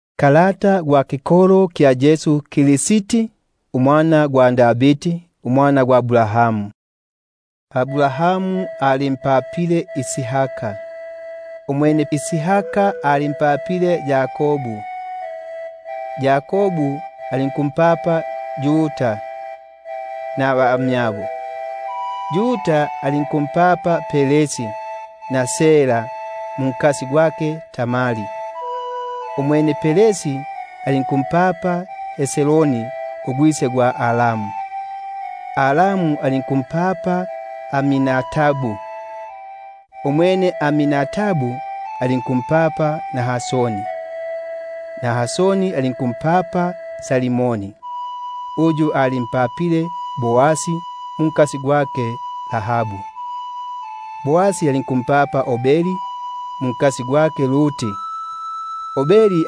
Kalata gwa kikolo kya Yesu Kristi, unnya Davidi, unnya Abrahamu. Abrahamu alinkumpapa Isaka; Isaka alinkumpapa Yakobu; Yakobu alinkumpapa Yuda nabamyabo; Yuda alinkumpapa Peresi na Sera mwa Tamari; Peresi alinkumpapa Hesroni; Hesroni alinkumpapa Aramu; Aramu alinkumpapa Aminadabu; Aminadabu alinkumpapa Naasoni; Naasoni alinkumpapa Salimoni; Salimoni alinkumpapa Boasi mwa Rahabu; Boasi alinkumpapa Obedi mwa Ruti; Obedi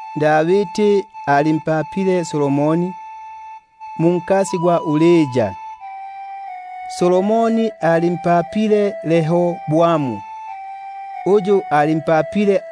Davidi alinkumpapa Solomoni munka-Uria; Solomoni alinkumpapa Rehoboamu; Rehoboamu alinkumpapa Abia;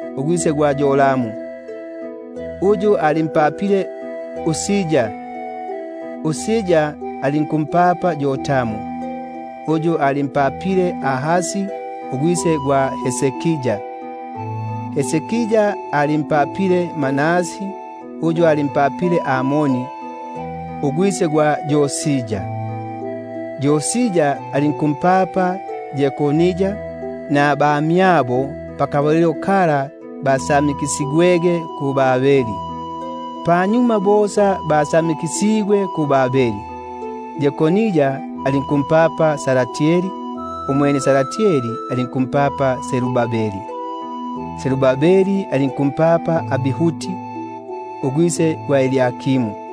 alinkumpapa Yoramu; Yoramu alinkumpapa Usia; Usia alinkumpapa Yotamu; Yotamu alinkumpapa Ahasi; Ahasi alinkumpapa Hezekia; Hezekia alinkumpapa Manase; Manase alinkumpapa Amosi; Amosi alinkumpapa Yosia; Yosia alinkumpapa Yekonia nabamyabo, pakabalilo ka kusamikisigwa ukubuka mu-Babiloni. Panyuma bo basamikisigwe mu-Babiloni, Yekonia alinku- mpapa Salatieli; Salatieli alinkumpapa Zerubabeli; Zerubabeli alinkumpapa Abihudi; Abihudi alinkumpapa Eliakimu;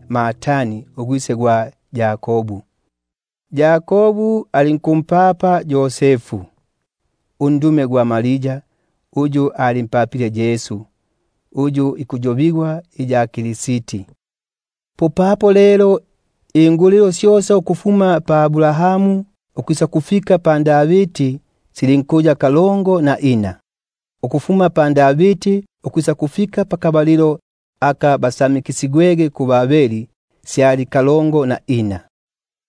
Matani alinkumpapa Yakobu; Yakobu alinkumpapa Yosefu undume gwa Maria, muli uyu apapigwemo Yesu uyu ikuyo- bigwa iya Kristi. Popapo lelo ingulilo syosa ukufuma pa Abrahamu ukufika pa Davidi sili kalongo na ina, ukufuma pa Davidi ukufika apa basamikisigwege mu-Babiloni sili kalongo na ina;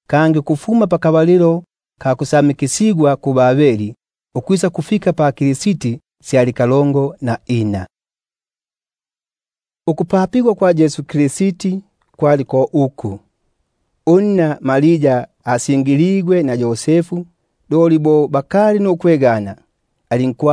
kangi ukufuma apa basamikisigwege mu-Babiloni ukufika pa Kristi sili kalongo na ina. Ukupapigwa kwa Yesu Kristi kwali bo uku: Bo unna Maria asingiligwe na Yosefu, bo bakali nukwegana, alinku-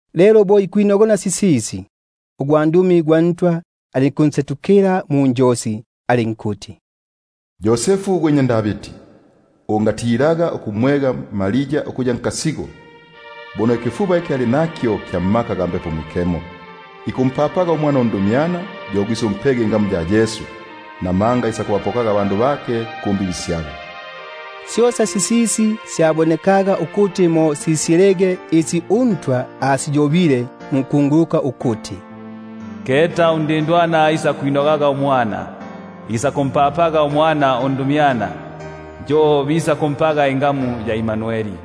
Umwene bo ikwinogona sisisi, alinkwaga ugwandumi gwa Ntwa ikunsetukila munjosi ikumbula ikuti: Yosefu gwe nnya Davidi, ungatilaga ukumwega Maria unkasigo; namanga ikifuba kyake kya mmaka ga Mbepo Mwikemo. Umwene isakumpapaga umwana undumyana, yo gwisʼumpege ingamu ya Yesu, buno yo isakubapokaga abandu bake kumbibi syabo. Syosa sisisi sisaga ukuti mo simalikilege sisyo uNtwa asiyobelege munkunguluka ukuti: Keta undindwana isakwinogaga, Isakumpapaga umwana undumyana, Yo bisakumpaga ingamu ya Imanueli;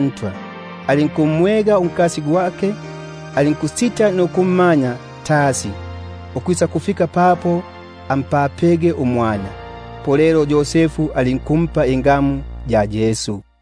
Ntwa, alinkumwega unkasi; alinkusita nukummanya tasi, ukwisakufika papo ampapege umwana; yo alinkumpa ingamu ya Yesu.